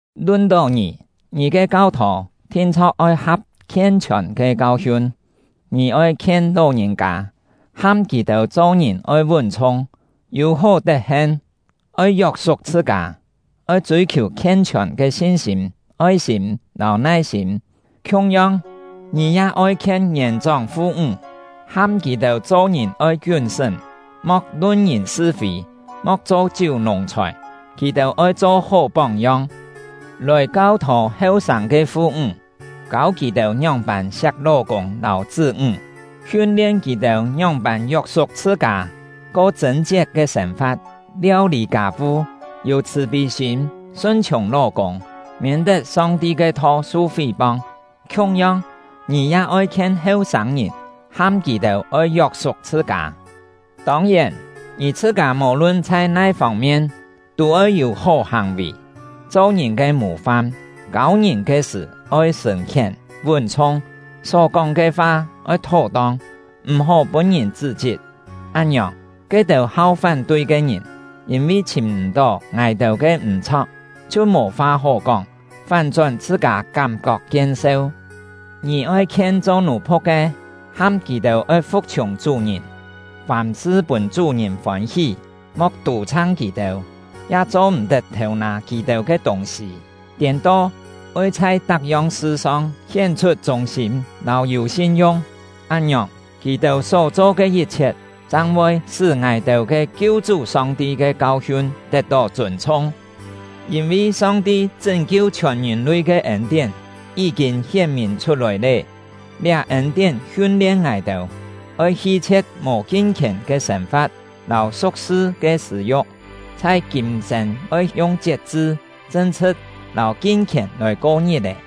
Lun-tó ngì, ngì ke kau-thô thin-chho̍k oi ha̍p khien-chhiòn ke kau-hiun. Ngì oi khien ló-ngìn-kâ, ham kì-têu cho-ngìn oi vún-chhung, yû hó tet-hen, oi yok-suk chhṳ-kâ, oi chûi-khiù khien-chhiòn ke sin-sîm, oi-sîm, lâu nai-sîm. Khiung-yong, ngì ya oi khien ngièn-chóng fu-ńg, ham kì-têu cho-ngìn oi kiún-sṳ́m, mo̍k lun ngìn sṳ-fî, mo̍k cho chiú nùng-chhòi. Kì-têu oi cho hó póng-yong, lòi kau-thô heu-sâng ke fu-ńg, kâu kì-têu ngióng-pân siak ló-kûng lâu chṳ́-ńg; hiun-lien kì-têu ngióng-pân yok-suk chhṳ-kâ, ko chṳ̂n-kiet ke sên-fa̍t, liau-lî kâ-vu, yû chhṳ̀-pî sîm, sun-chhiùng ló-kûng, miên-tet Song-ti ke tho su fí-pong. Khiung-yong, ngì ya oi khien heu-sâng-ngìn, ham kì-têu oi yok-suk chhṳ-kâ. Tông-yèn, ngì chhṳ-kâ mò-lun chhai nai fông-mien tû oi yû hó hàng-vì, cho ngìn ke mù-fam. Kâu ngìn ke sṳ̀ oi sṳ̀n-khién, vún-chhung, só kóng ke fa oi thó-tong, m̀-hó pûn-ngìn chṳ́-chit. Án-ngiòng, ke-têu hau fán-tui ke ngìn, yîn-vi chhìm m̀-tó ngài-têu ke m̀-chho̍k, chhiu mò fa hó kóng, fán-chón chhṳ-kâ kám-kok kien-seu. Ngì oi khien cho nù-phu̍k ke, ham kì-têu oi fu̍k-chhiùng chú-ngìn, fàm-sṳ pûn chú-ngìn fôn-hí, mo̍k tù-chhang kì-têu, ya cho-m̀-tet thêu-nâ kì-têu ke tûng-sî; tiên-to, oi chhai tak-yong sṳ-song hién-chhut chûng-sîm lâu yû sin-yung. Án-ngiòng, kì-têu só-cho ke yit-chhiet chang voi sṳ́ ngài-têu ke Kiu-chú Song-ti ke kau-hiun tet-tó chûn-chhung. Yîn-vi Song-ti chṳ́n-kiu chhiòn ngìn-lui ke ên-tién yí-kîn hién-mìn chhut-lòi lé. Liá ên-tién hiun-lien ngài-têu: Oi hi-chhie̍t mò kin-khièn ke sên-fa̍t lâu su̍k-sṳ ke sṳ̂-yu̍k; chhai kîm-sên oi yung chiet-chṳ, chṳn-chhṳ̍t, lâu kin-khièn lòi ko ngit-è,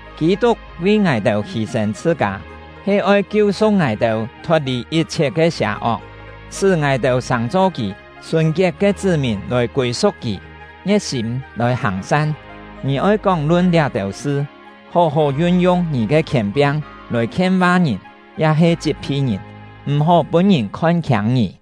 Kî-tuk vi ngài-têu hî-sên chhṳ-kâ, he oi kiu-su̍k ngài-têu thot-lì yit-chhiet ke sià-ok, sṳ́ ngài-têu sàng-cho kì sùn-kiet ke chṳ́-mìn lòi kûi-su̍k kì, ngie̍t-sîm lòi hàng-san. Ngì oi kóng-lun liá-têu sṳ, hó-hó yun-yung ngì ke khièn-piang lòi khien-miên ngìn ya-he chit-phi ngìn; m̀-hó pûn ngìn khon-khiâng ngì.